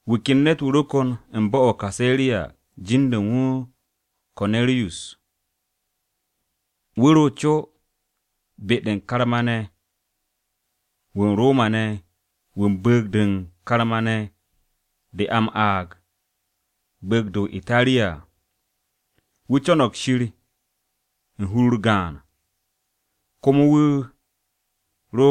Wu̱ ken ne̱t-wu̱ ro kon u̱n bo̱-o̱ o-Kaseriya jin-de u̱n wu̱ Ko̱neriyus. Wu̱ ro ko-caari-wu̱ u̱n karma-ne̱ wu̱ u̱n Roma-ne̱ wu̱ u̱n bu̱u̱g-de u̱n karma-ne̱ de a m-aag Bu̱u̱g-de o-Itariya à. Wu̱ co̱no̱g Shir u̱n hur-u̱r gaan, komo wu̱ ro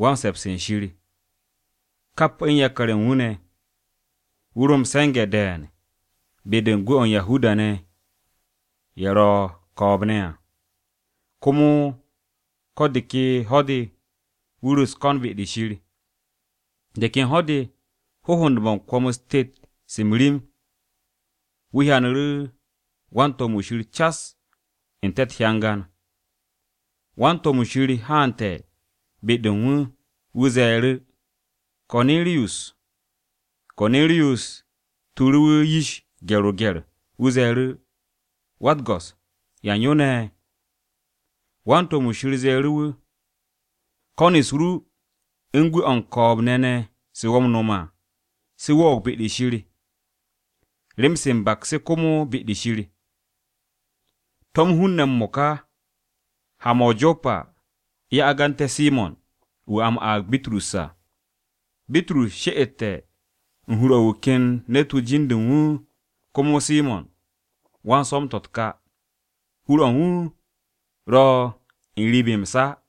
“Wan-se̱ps u̱n Shir,” kap u̱n yakar-ye̱ u̱n wu̱ ne̱. Wu̱ ro m-se̱nge̱ de̱e̱n be-de u̱n gwu̱-o̱ u̱n Yahuda-ne̱ ye̱ ro̱ ko̱o̱b-ne̱ à, komo ko̱ de ke ho̱-de wu̱ ro u̱s-ko̱n be-de Shir. De ken ho̱-de, hohond-mo̱ u̱n kwo̱m-u̱s tet-se m-rim, wu̱ hyanu̱ru̱ wan-to̱m-wu̱ Shir cas n-te̱ u̱t-hyangan. Wan-to̱m-wu̱ Shir haante̱ be-de u̱n wu̱, wu̱ ze̱e̱ru̱, “Ko̱neriyus!” Ko̱neriyus tuuru̱ wu̱ yish gye̱r-o-gye̱r, wu̱ ze̱e̱ru̱, “Wa-u̱t-Go̱s, ¿yan yo ne̱?” Wan-to̱m-wu̱ Shir ze̱e̱ru̱ wu̱, “Ko̱n-u̱s ru se u̱n gwu̱-o̱ u̱n ko̱o̱b-ne̱ ne̱ se wo̱ m-no̱m à, se wo̱o̱g be-de Shir, rem-se m-baks se komo be-de u̱n Shir. To̱m hun-ne̱ m-mo̱ka ha-mo̱ o-Jopa ye̱ agante̱ Simo̱n, wu̱ a m-aag Bitrus à. Bitrus she'ete̱ u̱n hur-o̱ u̱n wu̱ ken ne̱t-wu̱ jin-de u̱n wu̱ komo Simo̱n, wan-swo̱m-to̱ u̱t-ka. Hur-o̱ u̱n wu̱ ro̱ n-riib m-sa à.”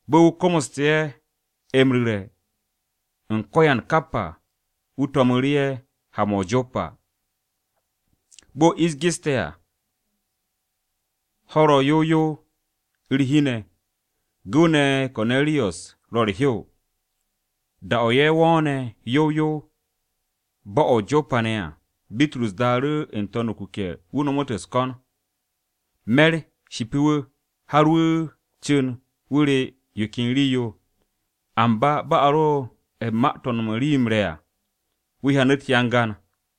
Bo̱ wu̱ komoste̱ ye̱ m-ru̱re̱ u̱n ko̱yan kap à, wu̱ to̱mu̱ru̱ ye̱ ha-mo̱ o-Jopa. Bo̱ ish geste̱ à, ho̱-u̱r ro yow yow u̱r-hi ne̱, gu̱w-ne̱ Ko̱neriyus ro̱ u̱r-hew. Da-o̱ ye̱ wo̱o̱ne̱ yow yow u̱n bo̱-o̱ o-Jopa ne̱ à, Bitrus daaru̱ n-to̱n o-kuke̱, wu̱ nomot u̱s-ko̱n. Me̱r shipi wu̱, har wu̱ cu̱n wu̱ re̱ yo ken rii-yo. Amba bo̱ a ro u̱n ma-to̱ u̱n no̱m u̱n rii-yo m-re̱ à, wu̱ hyanu̱ u̱t-hyangan.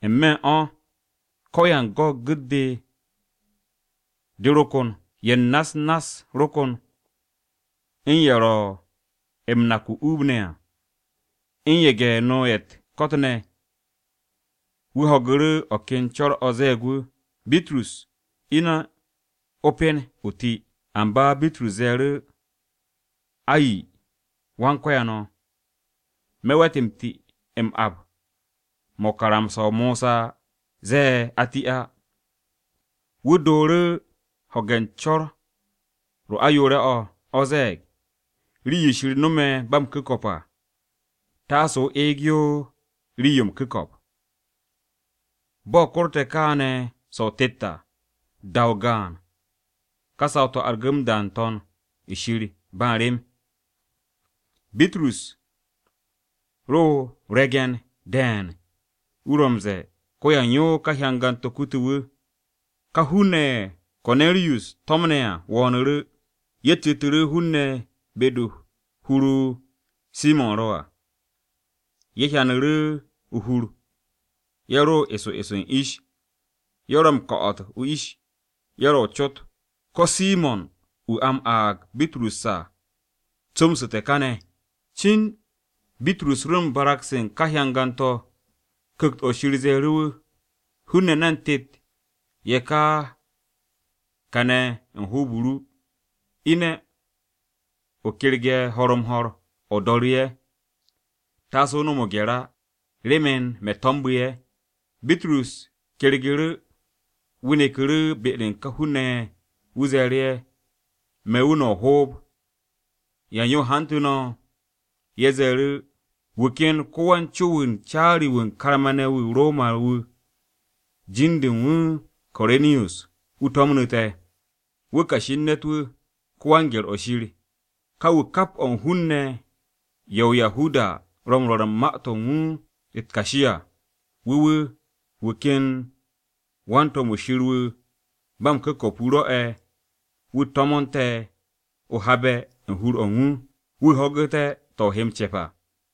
N-me̱ u̱n o̱, ko̱yan go̱n gu̱t-de, de ro kon. Ye̱ u̱n na-u̱s nass ro̱ ko̱n, u̱n ye̱ ro̱ m-nak o-uub ne̱ à, u̱n ye̱ge̱-no ye̱ u̱t-ko̱t ne̱. Wu̱ ho̱gu̱ru̱ o̱ ken co̱r-o̱ ze̱e̱g wu̱, “Bitrus, ine̱, o pen, o ti.” Amba Bitrus ze̱e̱ru̱, “Ay! Wan-Ko̱yan o̱, me̱ we̱t m-ti m-ap mo̱ karamsa-o Mosa ze̱e̱ a ti á.” Wu̱ dooru̱ ho̱ge̱ u̱n co̱r-o ayoore̱-o̱, o̱ ze̱e̱g, “Rii-yo Shir no̱me̱ ba m-ku̱ko̱p à, taase o eeg yo rii-yo m-ku̱ko̱p.” Bo̱ korte̱ kaane̱ so̱-o o-tet à, da-o gaan ka saw-to̱ argu̱ m-da n-To̱n shir ba m-rem. Bitrus ro o-ryegen de̱e̱n, wu̱ ro m-ze̱e̱ ko̱yan yo ka hyangan-to̱ kute̱ wu̱. Ka hun-ne̱ ye̱ Ko̱neriyus to̱mne̱ à wo̱o̱nu̱ru̱. Ye̱ citu̱ru̱ hun-ne̱ be-de hur-o Simo̱n ro̱ à. Ye̱ hyanu̱ru̱ o-hur, ye̱ ro eso eso u̱n ish. Ye̱ ro m-ko̱'o̱t o-ish, ye̱ ro o-cot, “¿Ko̱ Simo̱n wu̱ a m-aag Bitrus à comsu̱te̱ kane̱?” Cin Bitrus ro u̱n barag-se u̱n ka hyangan-to̱, Ku̱kt-o̱ Shir ze̱e̱ru̱ wu̱, “Hun-ne̱ ne̱n tet ye̱ ka kane̱ u̱n hoob-o ru. Ine̱, o kerge̱ ho̱r-m-ho̱r, o do̱ru̱ ye̱. Taase o ho̱ge̱ o-gye̱r á, remen me̱ to̱mbu̱ ye̱.” Bitrus kyergu̱ru̱, wu̱ neku̱ru̱ be-de u̱n ka hun-ne̱ ye̱. Wu̱ ze̱e̱ru̱ ye̱, “Me̱ wu̱ no̱ o-hoob. ¿Yan yo hantu̱ no̱?” Ye̱ ze̱e̱ru̱, “Wu̱ ken ko-caari-wu̱ u̱n ko-karma-wu̱ u̱n Roma-ne̱ wu̱, jin-de u̱n wu̱ Ko̱neriyus, wu̱ to̱mnu̱ te̱. Wu̱ kashi u̱n ne̱t-wu̱, ‘Wan-se̱ps u̱n Shir.’ Ka wu̱ kap o̱ u̱n hun-ne̱ ye̱ o-Yahuda ro̱ m-rwo̱r u̱n ma-to̱ u̱n wu̱ u̱t-kashi à. Wu̱ wu̱, wu̱ ken wan-to̱m-wu̱ Shir wu̱ ba m-ku̱ko̱p wu̱ rwo̱'e̱ wu̱ to̱mo̱nte̱ o habe̱ u̱n hur-o̱ u̱n wu̱, wu̱ ho̱gu̱té̱ to̱ o he m-ce̱p à.”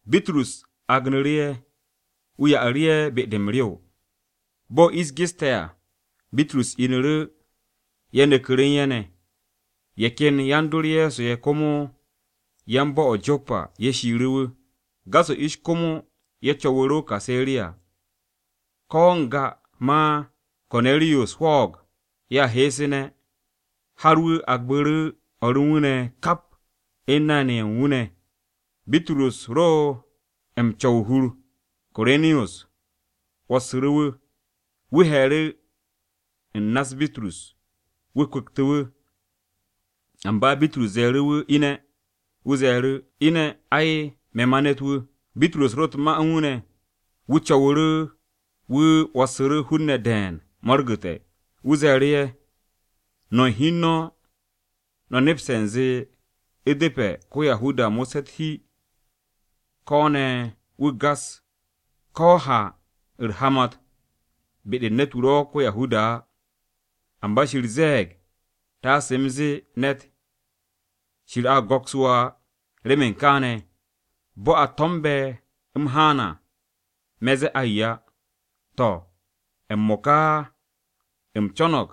Bitrus agnu̱ru̱ ye̱, wu̱ ya'aru̱ ye̱ be-de m-rew. Bo̱ ish geste̱ à, Bitrus inu̱ru̱, wu̱ neku̱ru̱ u̱n ye̱ ne̱. Ye̱ ken yan-dor Ye̱so ye̱ komo yan-bo̱-o̱ o-Jopa ye̱ shiiru̱ wu̱. Gas-o̱ ish komo ye̱ co̱wu̱ru̱ o-Kaseriya. Ko̱ n-ga ma Ko̱neriyus hwo̱o̱g ye̱a heesu̱ne̱, har wu̱ agbu̱ru̱ o̱r u̱n wu̱ ne̱ kap u̱n nay-ne̱ ye̱ u̱n wu̱ ne̱. Bitrus ro m-co̱w o-hur, Ko̱neriyus 'wo̱ssu̱ru̱ wu̱. Wu̱ he̱e̱ru̱ u̱n na-se u̱n Bitrus, wu̱ kwu̱ktu̱ wu̱. Amba Bitrus ze̱e̱ru̱ wu̱ ine̱, wu̱ ze̱e̱ru̱, “Ine̱! Ai, me̱ ma ne̱t-wu̱.” Bitrus ro u̱t-ma u̱n wu̱ ne̱, wu̱ co̱wu̱ru̱ wu̱ 'wo̱ssu̱ru̱ hun-ne̱ de̱e̱n mo̱rgu̱te̱. Wu̱ ze̱e̱ru̱ ye̱, “No̱ u̱n hi u̱n no̱, no̱ nepste̱ u̱nze u̱depe̱ ko-Yahuda mo̱sse̱ u̱r-hi ko̱ ne̱ wu̱ gas, ko̱ ha u̱r-hamat be-de u̱n ne̱t-wu̱ ro̱ ko-Yahuda á. Amba Shir ze̱e̱g taase u̱m zee ne̱t, ‘Shir a go̱ks wo̱ á.’ Remen kaane̱, bo̱ a to̱mbe̱ u̱m haan à, me̱ zee ay á. To̱, m-mo̱ka u̱m co̱no̱g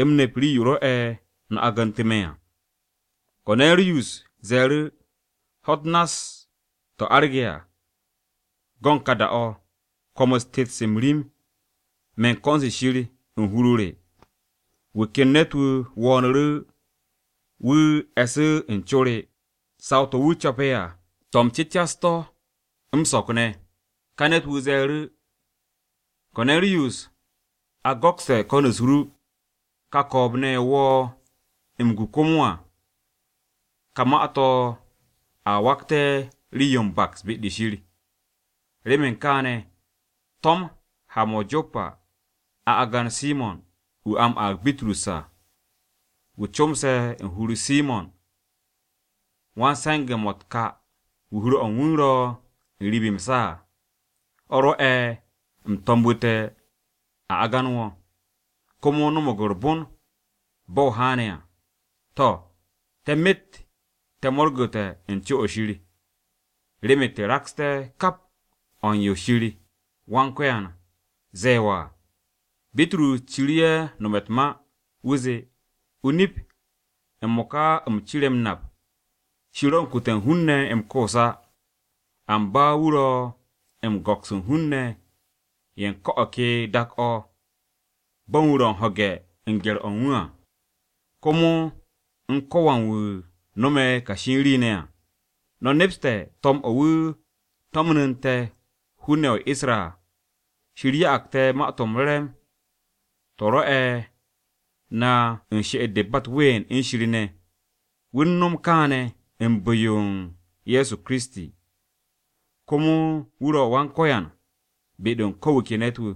u̱m nep rii-yo rwo̱'e̱ no̱ agantu̱ me̱ à.” Ko̱neriyus ze̱e̱ru̱, “Ho̱-u̱t nass-to̱ arge̱ à, go̱n ka da-o̱, kwo̱m-u̱s tet-se m-rim me̱ u̱n ko̱n-se Shir u̱n hur-o re. Wu̱ ken ne̱t-wu̱ wo̱o̱nu̱ru̱ wu̱ e̱su̱ u̱n co re. Saw-to̱ wu̱ co̱pe̱ à, to̱ m-cu̱cas to̱ m-so̱k ne̱. Ka ne̱t-wu̱ ze̱e̱ru̱, ‘Ko̱neriyus, a go̱kste̱ ko̱n-u̱s ru, ka ko̱o̱b-ne̱ ye̱ wo̱ m-gu komo à, ka ma-to̱ a wakte̱ rii-yo m-baks be-de Shir. Remen kaane̱, to̱m ha-mo̱ o-Jopa a agan Simo̱n, wu̱ a m-aag Bitrus à, wu̱ comse̱ u̱n hur-o Simo̱n wan-swo̱m-to̱ u̱t-ka, wu̱ hur-o̱ u̱n wu̱ ro̱ n-riib m-sa à.’ O̱ rwo̱'e̱, u̱m to̱mbu̱te̱ a agan wo̱, komo no̱mo̱g u̱r-bon bo̱ o haane̱ à. To̱, te̱ myet te̱ mo̱rgu̱te̱ u̱n co-o̱ Shir, remen te̱ raksté̱ kap o̱ u̱n yo Shir Wan-Ko̱yan ze̱e̱ wo̱ à.” Bitrus ciru̱ ye̱ nome̱ u̱t-ma, wu̱ zee, “O-nip, m-mo̱ka u̱m cire̱ m-nap Shir ro̱ u̱n kute̱ u̱n hun-ne̱ m-koos á. Amba wu̱ ro̱ m-go̱ks u̱n hun-ne̱ ye̱ u̱n ko̱ o̱ ke dak-o̱ bo̱ u̱n wu̱ ro̱ u̱n ho̱ge̱ u̱n gye̱r-o̱ u̱n wu̱ à, komo u̱n ko̱wan wu̱ no̱me̱ kashi rii ne̱ à. No̱ nepste̱ to̱m-o̱ wu̱ to̱mnu̱nte̱ hun-ne̱ ye̱ o-Isra à. Shir ya'ag te̱ Ma-to̱ m-Re̱re̱m to̱ rwo'e̱ na she'et-de ba u̱t-ween u̱n Shir ne̱ à. Wu̱ u̱n no̱m kaane̱ u̱n bu̱-o Ye̱so Kiristi, komo wu̱ ro̱ Wan-Ko̱yan be-de u̱n ko̱ wu̱ ke ne̱t-wu̱.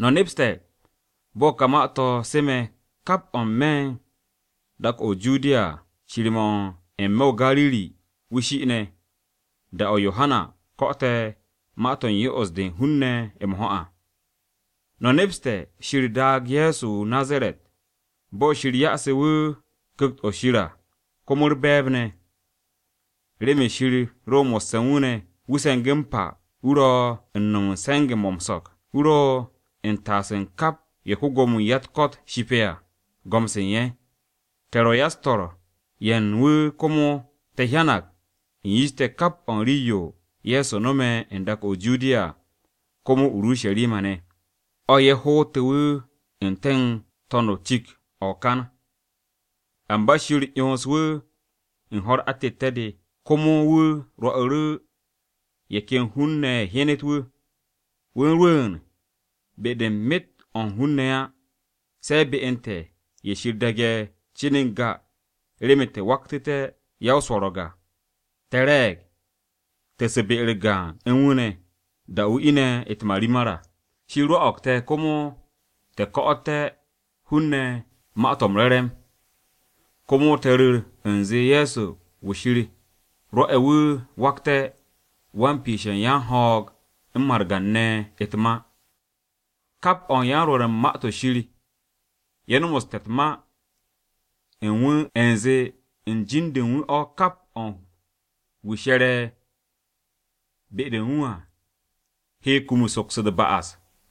No̱ nepste̱ bo̱ ka ma-to̱ seme̱ kap o̱ n-me̱ de u̱n dak-o̱ o-Judiya à, cir-mo̱ n-me̱ o-Gariri wu̱ shi'ine̱, da-o̱ Yohana ko̱'o̱te̱ ma-to̱ u̱n yo'os-de hun-ne̱ m-ho̱ à. No̱ nepste̱ Shir daage̱ Ye̱so wu̱ o-Nazaret, bo̱ Shir ya'ase̱ wu̱ Ku̱kt-o̱ Shir à, komo u̱r-be̱e̱b ne̱. Remen Shir ro mo̱sse̱ u̱n wu̱ ne̱, wu̱ se̱ngu̱ m-pa wu̱ ro u̱n no̱m u̱n se̱nge̱-mo̱ m-so̱k, wu̱ ro u̱n taase̱ u̱n kap ye̱ ko-Gwo̱mo-wu̱ u̱n ya-u̱t-ko̱t shipe̱ à, go̱m-se u̱n ye̱. “Te̱ ro̱ yan-swo̱-se u̱n wu̱ komo te̱ hyanag u̱n yish te̱ kap o̱ u̱n rii-yo Ye̱so no̱me̱ n-dak o̱ o-Judiya à, komo o-Urusharima ne̱. O̱ ye̱ hootu̱ wu̱ n-te̱ u̱n to̱n-o̱ cik-o̱ o-kan. Amba Shir 'yonsu̱ wu̱ u̱n ho̱-u̱r atette̱-de, komo wu̱ rwo'u̱ru̱ ye̱ ken hun-ne̱ ye̱ hyenet wu̱. Wu̱ rwu̱u̱n be-de u̱n myet o̱ u̱n hun-ne̱ á, se̱ be u̱n te̱ ye̱ Shir daage̱ cin n-ga remen te̱ waktu̱té̱ ya-o-so̱ro̱g à. Te̱ re̱e̱g, te̱ su̱ be-u̱r gaan u̱n wu̱ ne̱, da-o̱ wu̱ ine̱ u̱t-marimar à. Shir rwo̱'o̱g te̱ komo te̱ ko̱'o̱té̱ hun-ne̱ Ma-to̱ m-Re̱re̱m, komo te̱ ru̱r u̱nze Ye̱so wu̱ Shir rwo̱'e̱ wu̱ wakte̱ wan-piishe̱ u̱n yan-ho̱o̱g u̱n margan-ne̱ ne̱ u̱t-ma. Kap o̱ u̱n yan-Rwo̱r u̱n Ma-to̱ Shir ye̱ nomoste̱ u̱t-ma u̱n wu̱ u̱nze u̱n jin-de u̱n wu̱ o̱ kap o̱ u̱n wu̱ she̱re̱ be-de u̱n wu̱ à, he kum u̱n soks u̱t-ba'as.”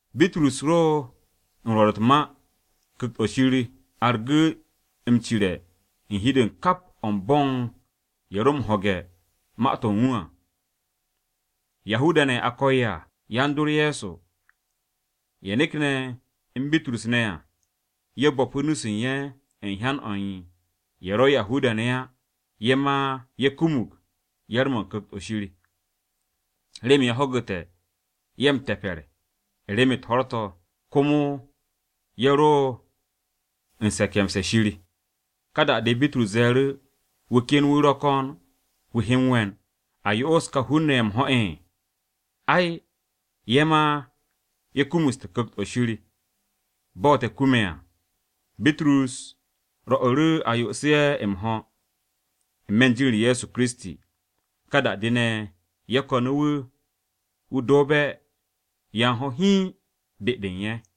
Bitrus ro u̱n rwo̱r u̱t-ma, Ku̱kt-o̱ Shir argu̱ m-cire̱ u̱n hi-de u̱n kap o̱ u̱n bo̱ u̱n ye̱ ro m-ho̱ge̱ u̱n ma-to̱ u̱n wu̱ à. Yahuda-ne̱ ye̱ a ko̱e̱ à, yan-dor Ye̱so, ye̱ nekne̱ u̱n Bitrus ne̱ à, ye̱ bo̱pu̱ nu-se u̱n ye̱ u̱n hyan-o̱ u̱n ye̱ ro̱ Yahuda-ne̱ á, ye̱ ma ye̱ kumug yar-mo̱ u̱n Ku̱kt-o̱ Shir. Remen ye̱ ho̱gu̱te̱ ye̱ m-te̱pe̱r u̱n rem-u̱t ho̱r-to̱, komo ye̱ ro u̱n se̱ke̱mse̱ u̱n Shir. Ka da-de Bitrus ze̱e̱ru̱, “¿Wu̱ ken wu̱ ro̱ ko̱n wu̱ he m-we̱n a yo'os ka hun-ne̱ ye̱ m-ho̱? Ai, ye̱ ma ye̱ kumuste̱ Ku̱kt-o̱ Shir bo̱ te̱ kume̱ à.” Bitrus rwo̱'u̱ru̱ a yo'os ye̱ m-ho̱ n-me̱ u̱n jin-u̱r Ye̱so Kiristi. Ka da-de ne̱, ye̱ ko̱nu̱ wu̱ wu̱ do̱o̱be̱ ya u̱n ho̱ hiin be-de u̱n ye̱.